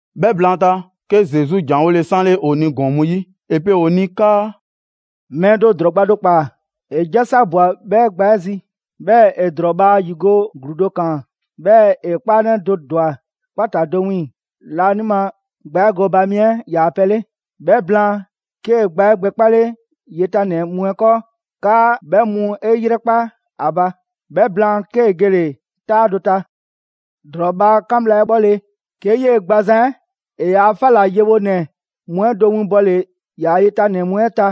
'Bhɛ blaanta, 'ke Zesu ‑janwole 'sanle ‑o ni ‑gɔɔn mu 'yi. ‑E pe ‑o ni 'kaa: «Mɛɛ do ‑drɔɔ gba do ‑kpaa, ‑e 'jasa ꞊bwa 'bhɛ gba 'ɛ zi, 'bhɛɛ‑ ‑e ‑drɔɔ bhaa 'yigo‑ ‑gluu do ‑kaan, 'bhɛɛ‑ ‑e 'kpaanɛ do ‑dwa 'kpata‑ do wiiŋ‑ laanima gba 'ɛ gooba mi 'ɛ ‑yaa' pɛ 'le. 'Bhɛ blaan, 'kee‑ gba 'ɛ gbɛkpale yetanɛ mu 'ɛ 'kɔɔ 'kaa 'bhɛ mu 'e 'yrɛkpa 'a ba. 'Bhɛ blaan 'kee‑ gele‑ 'taa do ta. ‑Drɔɔ bhaa 'kan bhla 'ɛ 'bhɔle‑, 'ke 'yee‑ gbazan 'ɛ ‑e ‑yaa' 'fa ‑la yewonɛ mu 'ɛ do 'winbɔle ‑yaa' yetanɛ mu 'ɛ ta,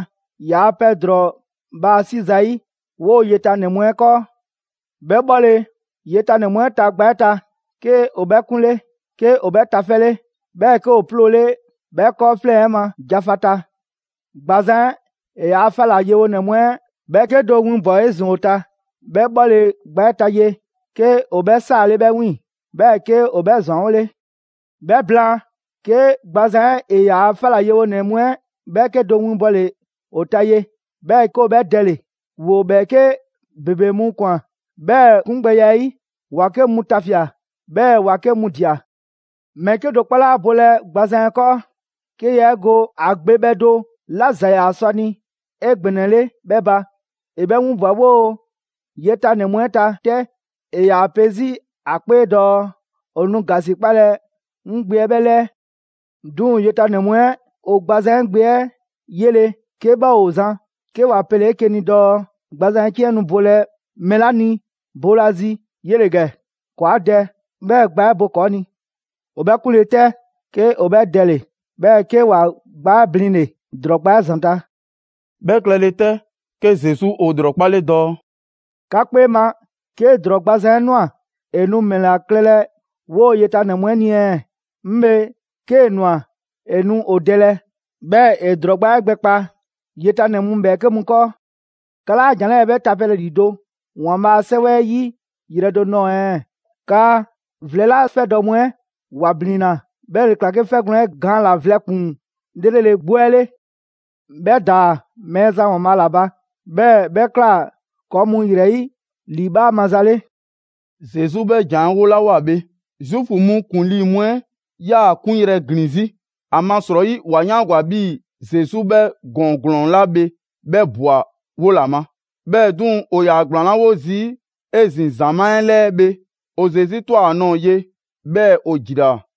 ‑yaa' pɛ ‑drɔɔ bhaa 'si zayi' 'woo‑ yetanɛ mu 'ɛ 'kɔɔ. 'Bhɛ 'bhɔle‑ yetanɛ mu 'ɛ ta gba 'ɛ ta, 'ke ‑o 'bhɛ 'kunle, 'ke ‑o bhɛ tafɛle, 'bhɛɛ‑ 'ke ‑o 'ploole 'bhɛ 'kɔɔfleŋ‑ 'ɛ ma jafata. Gbazan 'ɛ ‑e ‑yaa' 'fa ‑la yewonɛ mu 'ɛ ‑bhɛɛke' do 'winbwa‑ 'ezin‑ 'o ta. 'Bhɛ 'bhɔle‑ gba 'ɛ ta ye, 'ke ‑o 'bhɛ 'saale 'bhɛ 'wiiŋ‑, 'bhɛɛ‑ 'ke ‑o 'bhɛ ‑zwanwole. 'Bhɛ blaan, 'ke gbazan 'ɛ ‑e ‑yaa' 'fa ‑la yewonɛ mu 'ɛ 'bhɛɛke do winbɔle ‑o ta ye. 'Bhɛɛ‑ 'ke ‑o 'bhɛ dɛle‑. ‑Woo ‑bhɛɛke' ‑bebe mu ꞊kwan 'bhɛɛ‑ 'kungbɛya 'ɛ 'yi: ‑wa 'ke mu tafia꞊, 'bhɛɛ‑ ‑wa 'ke mu ꞊dia. Mɛɛ 'kedo‑ 'kpɔ 'laa bolɛ gbazan 'ɛ 'kɔɔ, 'ke yaa 'e ge ‑a gbe bhɛ do 'la ‑za ‑yaa sɔ ‑a ni 'egbɛnɛle 'bhɛ ba. ‑E 'bhɛ 'winbwa‑ 'woo‑ yetanɛ mu 'ɛ ta 'tɛ. ‑E ‑yaa pe 'zi ‑a 'kpee dɔɔ: ‹‑O nu ‑gasikpalɛ 'ŋ gbe 'ɛ 'bhɛ 'lɛɛ‑.› 'Duŋ‑ ‑yetanɛ mu 'ɛ ‑o gbazan 'ɛ gbe 'ɛ 'yele‑ 'ke 'bhɛ ‑o zan, 'ke ‑wa pele 'eke‑ ni dɔɔ: ‹Gbazan 'ɛ 'ciɛn 'ɛ nu bolɛ mɛɛ 'la ni boolazi, 'yele‑ ‑gɛ, ‑kɔɔ 'a dɛ, 'bhɛɛ‑ gba 'ɛ bo ‑kɔɔ' ni.› ‑O 'bhɛ 'kunle‑ 'tɛ, 'ke ‑o 'bhɛ dɛle‑, 'bhɛɛ‑ 'ke ‑wa gbaa 'ɛ blinle‑ ‑drɔɔ gba 'ɛ ‑zanta'.» 'Bhɛ klɛle 'tɛ, 'ke Zesu ‑o ‑lrɔkpale dɔɔ: «'Ka 'kpee ma, 'ke ‑drɔɔ gbazan 'ɛ ꞊nwa, ‑e nu ‑mɛla klɛlɛ 'woo‑ ‑yetanɛ mu 'ɛ ni ɛɛ? 'Ŋ bhe, 'kee‑ ꞊nwa, ‑e nu ‑o dɛlɛ, 'bhɛɛ‑ ‑e ‑drɔɔ gba 'ɛ gbɛkpa ‑yetanɛ mu ‑bhɛɛke' mu 'kɔɔ. 'Ka 'laa ‑jan 'lɛɛ‑ 'bhɛ tapelɛ ‑lido' ‑Waanbhaa' a 'Sɛwɛ 'ɛ 'yi yrɛ do nɔɔ‑ ɛɛ? 'Kaa: ‹Vlɛ 'la 'fɛdɔ‑ mu 'ɛ ‑wa ‑blinna, 'bhɛ ‑le ꞊kla 'ke 'fɛgwlɛ‑ 'ɛ gaan ꞊la vlɛ ‑kpuŋ 'lrele‑ 'gbu 'ɛ 'le. 'Bhɛ ‑daa Mɛɛzan ‑Waanbhaa' ‑la ba. 'Bhɛɛ‑ 'bhɛ ꞊kla ‑kɔɔ' mu ‑yrɛ 'yi, ‑liibhaa' maza 'le.›» Zesu 'bhɛ ‑jan 'ɛ 'wolawoa bhe, Zuufu mu ‑kuŋlii mu 'ɛ 'yaa‑ ‑a 'kunyrɛ‑ ‑glin 'zi. ‑Amasrɔyi ‑wa 'yaangwa‑ 'bhii‑ Zesu 'bhɛ ‑gɔɔn ‑glɔɔn 'la bhe 'bhɛ ꞊bwa 'wo ‑la ma. 'Bhɛɛ‑ 'duŋ‑, ‑o ‑yaa ‑gblaanlawo zi 'ezin‑ ‑zamaa' 'ɛ 'lɛɛ bhe, ‑o Zesu ꞊twa ‑a nɔɔ‑ ye, 'bhɛɛ‑ ‑o ‑jilaa.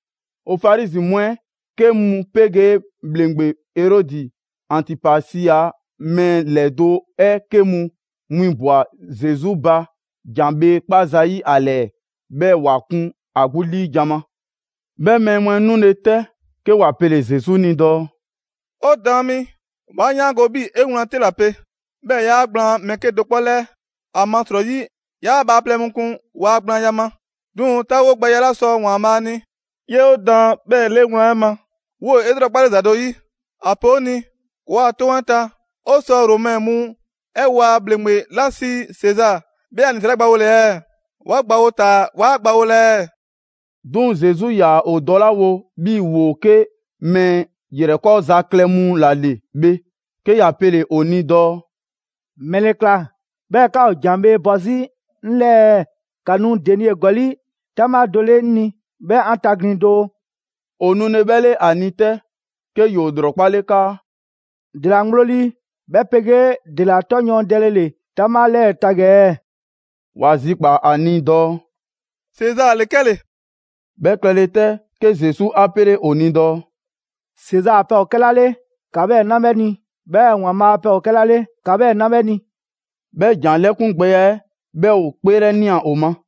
‑O Farizi mu 'ɛ 'ke mu 'pegee ‑bhleŋgbe Erɔdi Antipasi a mɛɛ ‑lɛdo' 'ɛ 'ke mu 'winbwa‑ Zesu ba ‑jan bhee 'kpaa zayi' ‑a ‑lɛɛ, 'bhɛɛ‑ ‑wa kun ‑a 'gbu 'liijan‑ ma. 'Bhɛ mɛɛ mu 'ɛ 'nule‑ 'tɛ, 'ke ‑wa pele‑ Zesu ni dɔɔ: «'O Daan mi, 'wa 'yaango‑ 'bhii‑ 'e wlan 'te ‑la pe, 'bhɛɛ‑ 'yaa gblaan mɛɛ 'kedo‑ 'kpɔ 'lɛɛ, ‑amasrɔyi 'yaa bhaaplɛŋ mu kun waa gblaanya ma, 'duŋ‑ 'taawogbɛya 'la sɔ ‑Waanbhaa' ni, 'yoo‑ daan 'bhɛɛ‑ 'le wlan 'ɛ ma. 'Woo‑ 'e 'lrɔkpale ‑za do ‑yi, ‑a pe 'o ni, ‑kɔɔa' 'toŋ 'ɛ ta, 'o sɔ ‑o Romɛ mu 'ɛ waa ‑Bhleŋgbe 'la sii Sezaa, 'bhɛ a 'nisra 'ɛ gbawole ɛɛ? 'Wa gbawo taa‑ 'waa gbawolɛ ɛɛ?» 'Duŋ‑ Zesu 'yaa‑ ‑o dɔlawo 'bhii‑ ‑woo 'ke mɛɛ ‑yrɛkɔɔza klɛ mu 'la 'le bhe, 'ke ‑ya pele‑ ‑o ni dɔɔ: «‑Mɛle ꞊kla 'bhɛɛ‑ 'ka ‑o ‑jan bhee bɔ zii' 'ŋ 'lɛɛ ɛɛ? ‑Ka nu denie ‑gɔli' 'taŋbha do 'le 'ŋ ni 'bhɛɛ‑ 'an taglin‑ doo!» ‑O nule 'bhɛ 'le ‑a ni 'tɛ, 'ke ‑yoo ‑lrɔkpale 'kaa: «‑Dela ŋgblo lii, 'bhɛ 'pegee ‑dela 'tɔ yɔɔndɛle ‑le 'taŋbha 'lɛɛ ta ‑gɛ ɛɛ?» ‑Wa zikpaa‑ ‑a ni dɔɔ: «Sezaa ‑le 'kɛle‑!» 'Bhɛ klɛle 'tɛ, 'ke Zesu 'a 'pele ‑o ni dɔɔ: «Sezaa a pɛ ‑o 'kɛla 'le, ‑ka 'bhɛɛ‑ 'na 'bhɛ ni, 'bhɛɛ‑ ‑Waanbhaa a pɛ ‑o 'kɛla 'le, ‑ka 'bhɛɛ‑ 'na 'bhɛ ni!» 'Bhɛ ‑jan 'lɛkungbɛya 'ɛ 'bhɛ ‑o 'kpeelɛnia ‑o ma.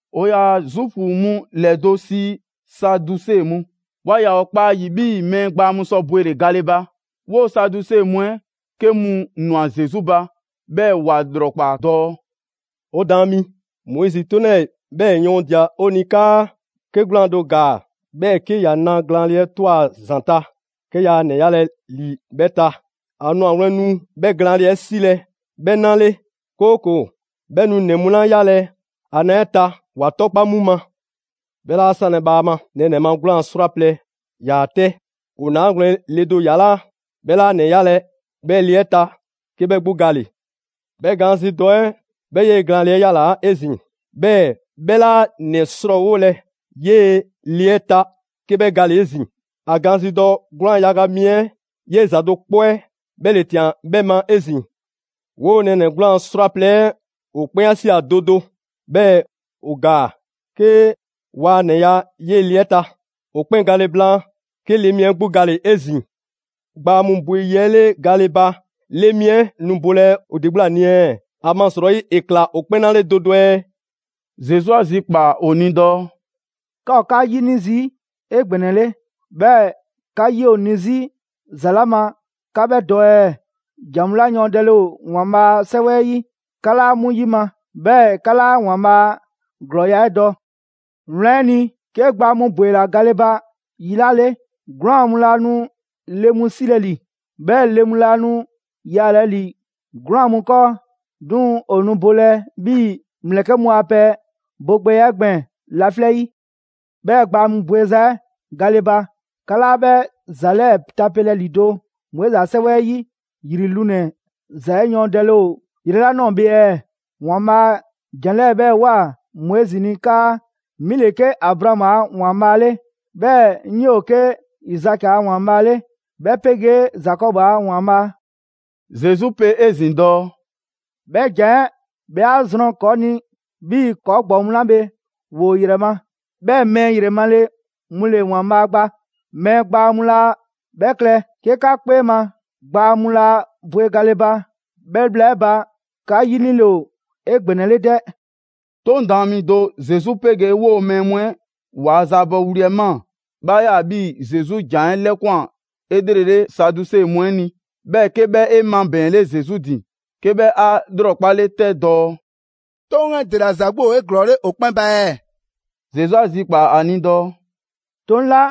‑O ‑yaa Zuufu mu ‑lɛdo' sii Saduse mu. Waa ‑yaa ‑o kpa ‑a ‑yi 'bhii‑ mɛɛ gbaa mu sɔ bwele‑ gale ba. 'Woo‑ Saduse mu 'ɛ 'ke mu ꞊nwa Zesu ba, 'bhɛɛ‑ ‑wa ‑lrɔkpaa dɔɔ: «'O Daan mi, Moizi 'toŋ 'lɛɛ‑ 'bhɛɛ‑ yɔɔndia‑ 'o ni 'kaa: 'Ke 'gwlaan‑ do ‑gaa, 'bhɛɛ‑ 'ke ‑ya na glaanle 'ɛ ꞊twa ‑a ‑zanta' 'ke yaa ‑nɛ yalɛ ‑li 'bhɛ ta. ‑A 'nwagwlɛn‑ nu 'bhɛ glaanle 'ɛ 'silɛ‑ 'bhɛ 'na 'le, 'kooko‑ 'bhɛ nu ‑nɛ mu 'la 'yalɛ‑ ‑a na 'ɛ ta, ‑wa 'tɔkpa‑ 'mu ma. 'Bhɛ 'laa 'sanlɛ‑ bhaama, nɛɛnɛ‑ ma 'gwlaan‑ 'srwaplɛ‑ ‑yaa 'tɛ. ‑O 'naagwlɛn‑ le do ‑yalaa', 'bhɛ 'laa ‑nɛ 'yalɛ‑ 'bhɛ 'le 'ɛ ta 'ke 'bhɛ 'gbu gale‑. 'Bhɛ gaanzidɔ 'ɛ, 'bhɛ 'yee‑ glaanle 'ɛ 'yalaa‑ 'ezin‑. 'Bhɛɛ‑ 'bhɛ 'laa ‑nɛ ‑srɔɔwolɛ 'yee‑ le 'ɛ ta 'ke 'bhɛ gale‑ 'ezin‑. ‑A gaanzidɔ 'gwlaan‑ yaga mi 'ɛ 'yee‑ ‑za do 'kpɔ 'ɛ 'bhɛ ‑le ꞊tian 'bhɛ ma 'ezin‑. 'Woo‑ nɛɛnɛ‑ 'gwlaan‑ 'srwaplɛ‑ 'ɛ ‑o 'kpɛn 'a ꞊sia do do, 'bhɛɛ‑ ‑o ‑gaa, 'ke ‑waa ‑nɛ ya 'yee‑ le 'ɛ ta. ‑O 'kpɛn gale blaan, 'ke le mi 'ɛ 'gbu gale‑ 'ezin‑. Gbaa mu bwe yi 'ɛ 'le gale ba, le mi 'ɛ nu bolɛ ‑o ‑de 'gbu ‑la ni ɛɛ, ‑amasrɔyi ‑e ꞊kla ‑o 'kpɛn 'na 'le do do ɛɛ?» Zesu 'a zikpaa‑ ‑o ni dɔɔ: «'Ka ‑o 'ka 'yini‑ zii' 'egbɛnɛle, 'bhɛɛ‑ 'ka 'yi ‑o ni 'zi ‑za 'la ma 'ka 'bhɛ dɔ ɛɛ? ‑Jan mu 'la yɔɔndɛle ‑o ‑Waanbhaa' a 'Sɛwɛ 'ɛ 'yi, 'ka 'laa 'mu 'yima‑, 'bhɛɛ‑ 'ka 'laa ‑Waanbhaa' a ‑glɔɔya' 'ɛ dɔ. Wlan 'ɛ ni, 'ke gbaa mu ‑bwela gale ba yi 'la 'le, 'gwlaan‑ mu laa nu le mu 'silɛ‑ ‑li, 'bhɛɛ‑ le mu laa nu yaalɛ ‑li 'gwlaan‑ mu 'kɔɔ, 'duŋ‑ ‑o nu bolɛ 'bhii‑ ‑mlɛkɛ' mu a pɛ bogbɛya 'ɛ gbɛɛn‑ laflɛ' 'yi. 'Bhɛɛ‑ gbaa mu bweza 'ɛ gale ba, 'ka 'laa 'bhɛ ‑za 'lɛɛ‑ tapelɛ ‑lido' Moizi ‑a 'sɛwɛ 'ɛ 'yi, ‑yri lunɛ‑ ‑za 'ɛ yɔɔndɛle ‑o yrɛ 'la ꞊nɔɔ bhe ɛɛ? ‑Waanbhaa' ‑jan 'lɛɛ‑ 'bhɛɛ‑ ꞊woa Moizi ni 'kaa: ‹'Mi ‑le 'ke Abraamu a ‑Waanbhaa' 'le, 'bhɛɛ‑ 'ŋ 'yoo‑ 'ke Izaki a ‑Waanbhaa' 'le, 'bhɛ 'pegee Zakɔbu a ‑Waanbhaa'.›» Zesu pe 'ezin‑ dɔɔ: «'Bhɛ ‑jan 'ɛ 'bhɛ 'a zrɔn ‑kɔɔ' ni 'bhii‑ ‑kɔɔ' ‑gbɔɔ mu 'la bhe ‑woo ‑o ‑yrɛ ma. 'Bhɛɛ‑ mɛɛ ‑yrɛmale mu ‑le ‑Waanbhaa' gba, mɛɛ gbaa mu laa 'bhɛ klɛ. 'Ke 'ka 'kpee ma, gbaa mu laa bwe gale ba, 'bhɛ bhla 'ɛ ba, 'ka 'yinile ‑o 'egbɛnɛle 'dɛ.» 'Toŋ daan mi do Zesu 'pegee 'woo‑ mɛɛ mu 'ɛ ‑waa' zaabɔ wli 'ɛ ꞊maa. 'Bhɛ 'a ꞊ya 'bhii‑ Zesu ‑jan 'ɛ 'lɛkwan‑ 'elrele Saduse mu 'ɛ ni. 'Bhɛɛ‑ 'ke 'bhɛ 'e 'mabɛɛnle Zesu ‑din, 'ke 'bhɛ 'a 'lrɔkpale 'tɛ dɔɔ: «'Toŋ 'ɛ ‑dela ‑za 'gbu ‑o 'eglɔɔle ‑o 'kpɛn ba ɛɛ?» Zesu 'a zikpaa‑ ‑a ni dɔɔ: «'Toŋ 'la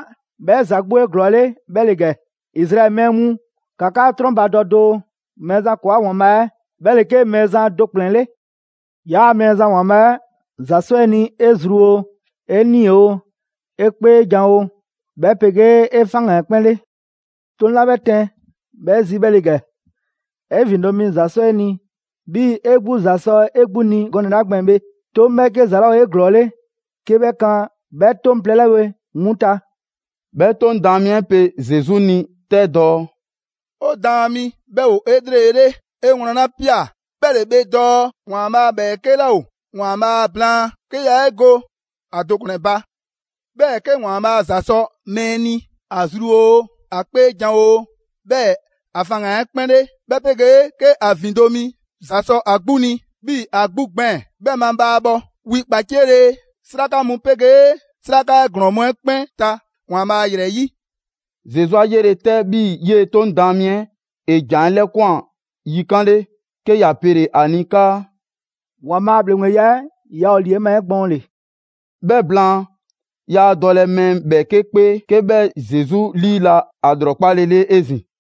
'bhɛ ‑za 'gbu ‑o 'eglɔɔle 'bhɛ ‑le ‑gɛ: ‹Izraɛli mɛɛ mu, ‑ka 'ka 'trɔnbadɔ doo, Mɛɛzan ‑kɔɔa' ‑Waanbhaa' 'ɛ, 'bhɛ ‑le 'ke Mɛɛzan do ‑kplɛn 'le. 'Yaa‑ Mɛɛzan ‑Waanbhaa 'ɛ, ‑za 'sɔ 'e ni 'e zru oo, 'e 'nii‑ oo, 'e 'kpeejan‑ oo, 'bhɛ 'pegee 'e faŋgan‑ 'ɛ 'kpɛn 'le.› 'Toŋ 'la 'bhɛ tɛn 'bhɛ zi 'bhɛ ‑le ‑gɛ: ‹'E ‑vindo' mi ‑za 'sɔ 'e ni 'bhii‑ 'e 'gbu ‑za sɔ 'e 'gbu ni gɔnɛ‑ 'la gbɛɛn‑ bhe.› 'Toŋ 'bhɛɛke ‑za 'laa ‑o 'eglɔɔle 'ke 'bhɛ kan 'bhɛ 'toŋ plɛ 'la bhe 'mu ta.» 'Bhɛ 'Toŋ daan mi 'ɛ pe Zesu ni 'tɛ dɔɔ: «'O Daan mi, 'bhɛ ‑o 'elrele, 'e wlan ‑la ‑pia 'bhɛ 'le bhe dɔɔ ‑Waanbhaa' ‑bhɛɛke' 'laa ‑o ‑Waanbhaa' blaan, 'ke yaa 'e go ‑a do ‑kplɛn ba. 'Bhɛɛ‑ 'ke ‑Waanbhaa' ‑za sɔ mɛɛ ni ‑a zru oo, ‑a 'kpeejan‑ oo, 'bhɛɛ‑ ‑a faŋgan‑ 'ɛ 'kpɛn 'le, 'bhɛ 'pegee 'ke ‑a ‑vindo' mi ‑za sɔ ‑a 'gbu ni 'bhii‑ ‑a 'gbu gbɛɛn‑, 'bhɛ mabhaabhɔ wi 'kpaciele 'sraka mu 'pegee 'sraka 'ɛ ‑glɔɔn mu 'ɛ 'kpɛn ta ‑Waanbhaa' ‑yrɛ 'yi.» Zesu 'a 'yele‑ 'tɛ 'bhii‑ 'yee 'Toŋ daan mi 'ɛ ‑e ‑jan 'ɛ 'lɛkwan‑ yikan' 'le, 'ke ‑ya pele ‑a ni 'kaa: «‑Waanbhaa' a ‑bhleŋgbeya 'ɛ yaa ‑o ‑li 'e ma 'egbɔɔnle.» 'Bhɛ blaan, yaa dɔlɛ mɛɛ ‑bhɛɛke' 'kpee 'ke 'bhɛ Zesu 'liila‑ ‑a ‑lrɔkpalele 'ezin‑.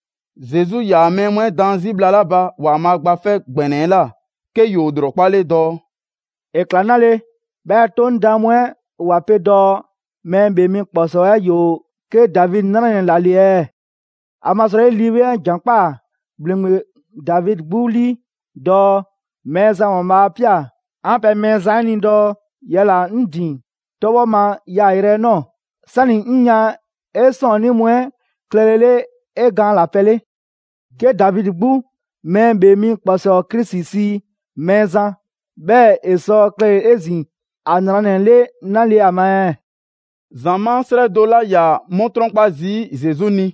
Zesu 'yaa‑ mɛɛ mu 'ɛ daan 'zi bhla 'la ba ‑Waanbhaa' Gba 'Fɛ ‑Gbɛnɛ 'ɛ ꞊la, 'ke ‑yoo ‑lrɔkpale dɔɔ: «‑E ꞊kla 'nale‑ 'bhɛɛ‑ 'Toŋ daan mu 'ɛ ‑wa pe dɔɔ Mɛɛ ‑Bhee Mi ‑Kpɔsɔɔ 'ɛ ‑yoo 'ke Davidi 'nranɛ‑ ‑la 'le ɛɛ? ‑Amasrɔyi Lii 'Weŋ 'ɛ ‑jan ꞊kpaa ‑Bhleŋgbe Davidi 'gbu 'lii dɔɔ: ‹Mɛɛzan ‑Waanbhaa' 'a ꞊pia 'an pɛ Mɛɛzan 'ɛ ni dɔɔ: Yala‑ 'ŋ ‑din 'tɔbhɔ ma yaayrɛ 'ɛ ꞊nɔɔ, 'sani‑ 'ŋ yan 'e 'sɔɔnnii mu 'ɛ klɛlele 'e gaanlapɛ 'le.› 'Ke Davidi 'gbu Mɛɛ ‑Bhee Mi ‑Kpɔsɔɔ Krisi sii ‹Mɛɛzan›. 'Bhɛɛ‑ ‑e sɔ klɛle 'ezin‑ ‑a ‑nranɛ 'le 'nale‑ ‑a ma ɛɛ?» ‑Zamaa' 'srɛ do 'la 'yaa‑ 'mu 'trɔnkpa zii' Zesu ni,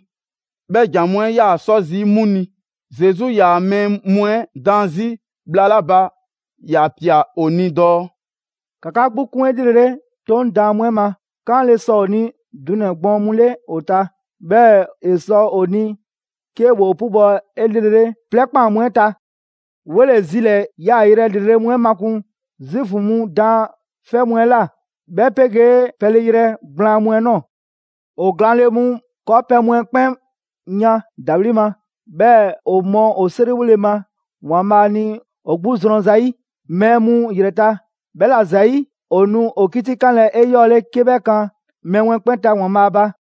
bhɛ ‑jan mu 'ɛ 'yaa‑ 'sɔ zii' 'mu ni. Zesu 'yaa‑ mɛɛ mu 'ɛ daan 'zi bhla 'la ba ‑ya ꞊pia ‑o ni dɔɔ: «‑Ka 'ka 'gbu 'kun 'elrele 'Toŋ daan mu 'ɛ ma. 'Kaanle‑ sɔ ‑o ni dunɛ‑ gbɔɔn mu 'le ‑o ta, 'bhɛɛ‑ ‑e sɔ ‑o ni 'ke ‑woo 'pubɔ‑ 'elrele 'plɛɛ 'kpaan‑ mu 'ɛ ta. 'Wole‑ zilɛɛ‑ yaayrɛ ‑lrele' mu 'ɛ makun Zuufu mu daanfɛ' mu 'ɛ ꞊la, 'bhɛ 'pegee pɛleyrɛ gblaan mu 'ɛ ꞊nɔɔ. ‑O glaanle mu 'kɔɔpɛ‑ mu 'ɛ 'kpɛn yan ‑dawli' ma. 'Bhɛɛ‑ ‑o mɔ ‑o 'seriwole ma ‑Waanbhaa' ni ‑o 'gbu zrɔn zayi' mɛɛ mu ‑yrɛ ta. 'Bhɛla‑ ‑zayi', ‑o nu ‑o 'kitikanlɛ 'eyɔɔle 'ke 'bhɛ kan mɛɛ mu 'ɛ 'kpɛn ta ‑Waanbhaa' ba.»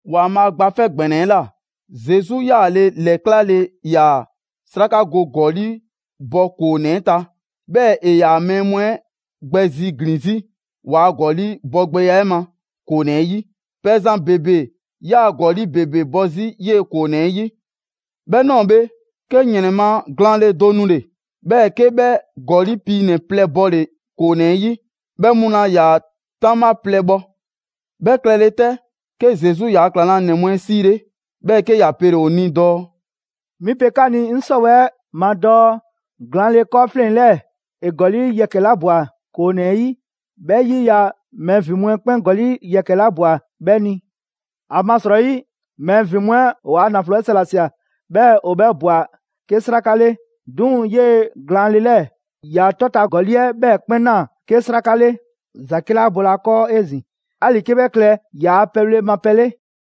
‑Waanbhaa' Gba 'Fɛ ‑Gbɛnɛ 'ɛ ꞊la, Zesu 'yaale‑ ‑lɛklale ‑yaa 'sraka go ‑gɔli' bɔ ‑koonɛ 'ɛ ta. 'Bhɛɛ‑ ‑e ‑yaa mɛɛ mu 'ɛ gbɛ zi ‑glin 'zi ‑waa' ‑gɔli' bɔgbɛya 'ɛ ma ‑koonɛ 'ɛ 'yi. Pɛzan ‑bebe 'yaa‑ ‑gɔli' ‑bebe bɔ 'zi 'yee‑ ‑koonɛ 'ɛ 'yi. 'Bhɛ ꞊nɔɔ bhe, 'ke ‑yrɛn ma glaanle do nule‑, 'bhɛɛ‑ 'ke 'bhɛ ‑gɔli' piinɛ‑ plɛ bɔle‑ ‑koonɛ 'ɛ 'yi. 'Bhɛ mu laa ‑yaa 'taŋbha plɛ bhɔ. 'Bhɛ klɛle 'tɛ, 'ke Zesu ‑yaa' ‑klaŋlanɛ mu 'ɛ 'siile, 'bhɛɛ‑ 'ke ‑ya pele ‑o ni dɔɔ: «'Mi pe 'ka ni 'ŋ 'sɔwɛɛ‑ 'ɛ ma dɔɔ glaanle 'kɔɔfleŋ‑ 'lɛɛ‑ ‑e ‑gɔli' yɛkɛ‑ 'la ꞊bwa ‑koonɛ 'ɛ 'yi, 'bhɛ 'yiya‑ mɛɛ ‑vin mu 'ɛ 'kpɛn ‑gɔli' yɛkɛ‑ 'la ꞊bwa 'bhɛ ni. ‑Amasrɔyi mɛɛ ‑vin mu 'ɛ ‑o waa ‑naflo 'ɛ sa ‑la ꞊sia, 'bhɛɛ‑ ‑o 'bhɛ ꞊bwa 'ke 'sraka 'le. 'Duŋ‑ 'yee‑ glaanle 'lɛɛ‑, ‑ya 'tɔta‑ ‑gɔli' 'ɛ 'bhɛɛ‑ 'kpɛn ꞊naa 'ke 'sraka 'le. ‑Zake' 'laa bolɛ ‑a 'kɔɔ 'ezin‑, 'ali‑ 'ke 'bhɛ klɛ ‑yaa' pɛbhle ma pɛ 'le.»